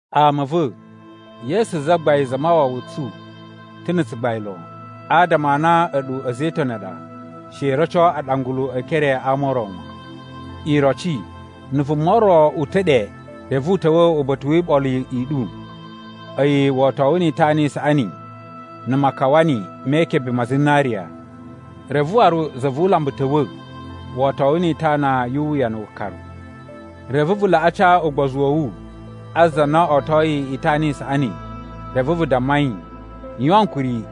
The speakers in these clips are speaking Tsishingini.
Ama a̱ va̱, Yesu Zagbain Zamawawa tsu ta̱ na̱ tsugbain lon. Adama a na a̱ɗu a̱za̱ e Itoni a ɗa, she i roco aɗangulu e ekere a ama o ro wan. Iroci, na̱ vuma ro uta̱ ɗe reve u ta̱wa̱ uba̱ta̱ wi iɓolo i ɗu, a̱yi wotowu ni itana i saꞌani na̱ makawani me ikebe ma zinariya, reve waru za vu ulambu ta̱wa̱ wotowu ni itana yu uwuyanu wukaru. Reve vu laꞌa ca ugbozu wa̱ wu a za na otoyi itana i saꞌani, reve vu damma yi, “Yuwan ankuri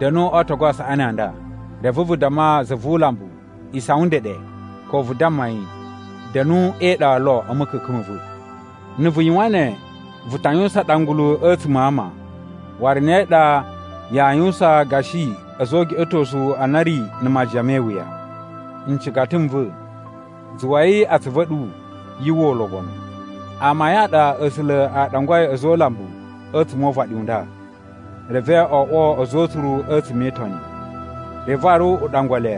da̱nu o ootogu a saꞌani a nda.” Reve vu damma za vu ulambu, “Isawan ndeɗe,” ko vu damma yi, “Da̱nu e iɗa lo a̱ ma̱ka̱ka̱n ma̱ va̱.” Na̱ vu yuwan ne, vu ta yuwusan aɗangulu a̱tsuma̱ a ama, waru ne ɗa yaa yuwusan gashi a̱za̱ o ugeꞌetosu a na a̱ ri na̱ majiyan me iwuya. Ncigata n va̱, zuwai atsuvu a̱ ɗu yu uwwa ulobonu: Amayun a ɗa A̱sula̱ a ɗangwai a̱za̱ o ulambu a̱tsuma̱ o uvaɗi u nda, reve o oꞌwo a̱za̱ o utsuru a̱tsuma̱ e Itoni. Reve waru u ɗangwa le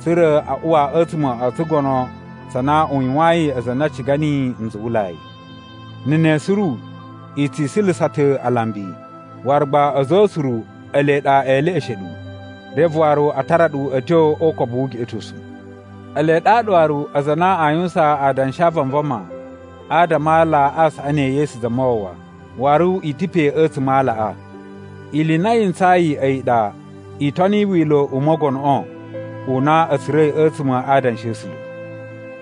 tsa̱ra̱ a uwa a̱tsuma̱ o tsugono tsa na u yuwayin aza a na a ciga niyi nzuwulai. Na̱ ne suru, i tsi isulusa ta̱ alambi! Waru gba a̱za̱ o utsuru ele ɗa e leꞌeshe ɗu, reve waru a tara ɗu a̱ tyo o ukobu wu ugeꞌetosu. Ele ɗaɗa waru aza a na aa yuwusan adanshi a vanvama adama a ala a saꞌani e Yesu Zamawawa, waru i ta̱ pe a̱tsuma̱ a alaꞌa. Ili i na yi ntsayi a̱yi ɗa i toni wila̱ u Mogonoꞌo u na a̱ tsura̱i a̱tsuma̱ a Adanshi a̱ A̱sula̱,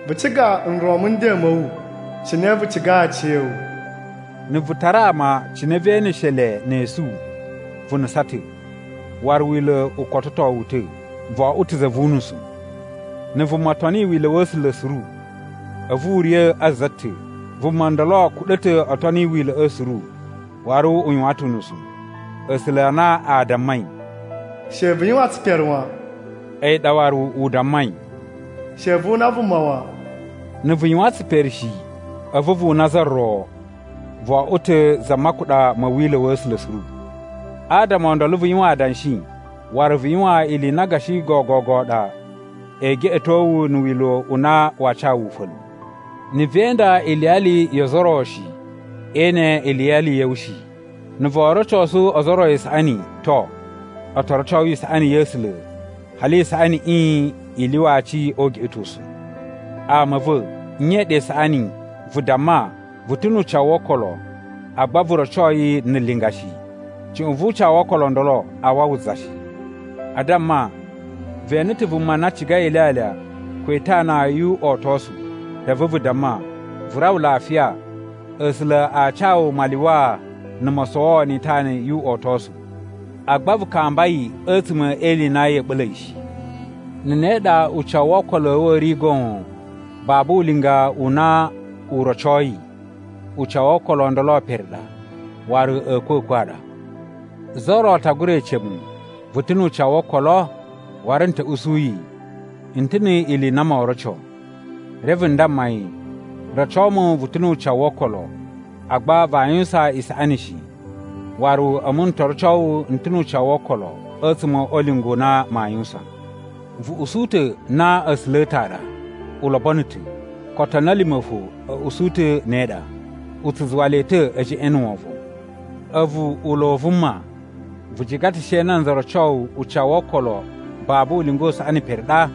“Vu ciga nron mu nden ma̱ wu, cine vu cigai aciya̱wu.” Na̱ vu tara ama cine vee eneshe le ne esu, vu nusan ta̱, waru Wila̱ u kototo wu ta̱, vo oꞌwo ta̱ za vu unusu. Na̱ vuma toni Wila̱ wa̱ A̱sula̱ suru, a̱vu u riya̱ a za ta̱, vuma ndolo kuɗa̱ ta̱ o toni wila̱ꞌa̱ suru waru u yuwan ta̱ unusu. A̱sula̱ a na a dammai, “She vu yuwan tsipere wan,” a̱yi ɗa waru u dammai, “She vu una vuma wan.” Na̱ vu yuwan tsipere shi, a̱vu vu una za ro, vo oꞌwo ta̱ za makuɗa ma̱ Wila̱ wa̱ A̱sula̱ suru. Adama o ndolo vu yuwan adanshi, waru vu yuwan ili i na gashi gogogo ɗa e geꞌeto wu na̱ wila̱ u na waa ca wu ufa̱lu. Na̱ vee inda iliyali yo ozo o ro shi, ee ene iliyali ya̱ wu shi. Na̱ voo rocosu ozo o ro isaꞌani, to, o to roco wu isaꞌani ya̱ A̱sula̱ hali isaꞌaniꞌi i lyuwa aci o ugeꞌetosu. Ama a̱ va̱, nye i ɗa isaꞌani, vu damma, vu ta̱ nu ucawu wo okolo, agba vu roco yi na̱ linga shi? Cuꞌun vu ucawu wo okolo o ndolo aa wawa za shi. A damma, ve ene ta̱ vuma na cigai ilyalya ko itana yu uꞌotosu, reve vu damma, “Vu rawa lafiya, A̱sula̱ a ca wu malyuwaa na̱ mosowoo ni itana yu uꞌotosu,” agba vu kamba yi a̱tsuma̱ e ili i na ya̱a̱ ɓa̱la̱ yi shi. Na̱ ne ɗa ucawu wo okolo a̱ wu a̱ ri goon, babu ulinga u na u rocoi, ucawu wo okolo o ndolo pere ɗa, waru a̱a̱kwa̱kwa̱ a ɗa. Za ro ta gura ece mu, “Vu ta̱ nu ucawu wo okolo?” Waru n ta̱ usu yi, “N ta̱ ni ili i na moo roco.” Reve n damma yi, “Roco mu vu ta̱ nu ucawu wo okolo, agba vaa yuwusan isaꞌani shi, waru a̱mu n to roco wu n ta̱ nu ucawu wo okolo a̱tsuma̱ o ulinga u na maa yuwusan.” Vu usu ta̱ na A̱sula̱ a̱ ta̱ a ɗa. U lobono ta̱. Ko otoni a̱ lima̱ fo a̱ usu ta̱ ne ɗa, u tsu zuwa le ta̱ e jeꞌen na̱ wovon. A̱vu ulo u vuma! Vu ciga ta̱ she nanza roco wu ucawu wo okolo babu ulinga u saꞌani pere ɗa?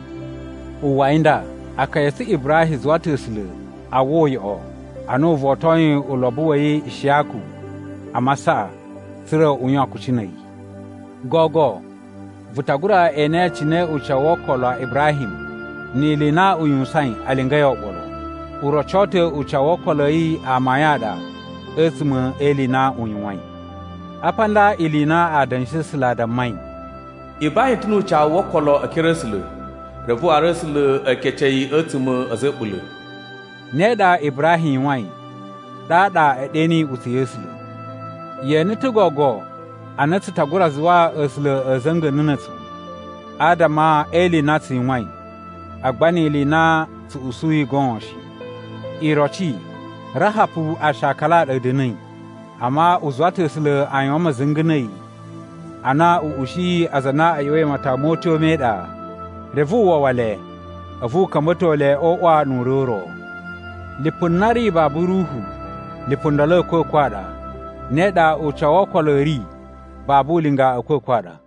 Uwwai nda, akaya a̱ tsu Ibrahim zuwa ta̱ A̱sula̱ a uwwa uyoꞌo ana u votoyin ulobo wa̱ yi Ishiyaku a masaꞌa, tsa̱ra̱ u yuwan kucci na̱ a̱yi. Gogo vu ta gura ene cine ucawu wo okolo a Ibrahim ni ili i na u yuwusain a lingai oɓolo. U roco ta̱ ucawu wo okolo a̱ yi amayun a ɗa a̱tsuma̱ e ili i na u yuwain. Apa nda ili i na Adanshi a̱ A̱sula̱ a dammai, “Ibrahim ta̱ nu ucawu wo okolo e ekere a̱ A̱sula̱, reve waru A̱sula̱ e kece yi a̱tsuma̱ a̱ a̱za̱ a̱ a̱ɓula̱.” Ne ɗa Ibrahim yuwain ɗaɗa e ɗe niyi iꞌutsa̱ ya̱ A̱sula̱. Ye ene ta̱ gogo a na tsu ta gura zuwa A̱sula̱ a̱ za̱nga̱na̱ na̱ a̱tsu adama e ili i na tsu yuwain, agba ni ili i na tsu usuyi goon shi. Iroci, Rahapu aashakala a ɗa a̱ da̱na̱i. Amma u zuwa ta̱ A̱sula̱ a yuwan ma̱za̱nga̱ na̱ a̱yi ana u ushiyi aza a na a̱ ꞌya̱wa̱i matawa mo utyo me iɗa, reve u wawa le a̱vu u ka̱mba̱to le o uꞌwa nu ure u ro. Lipu na ri babu ruhu, lipu ndolo a̱kwa̱kwa̱ a ɗa, ne ɗa ucawu wo okolo a̱ ri babu ulinga a̱a̱kwa̱kwa̱ a ɗa!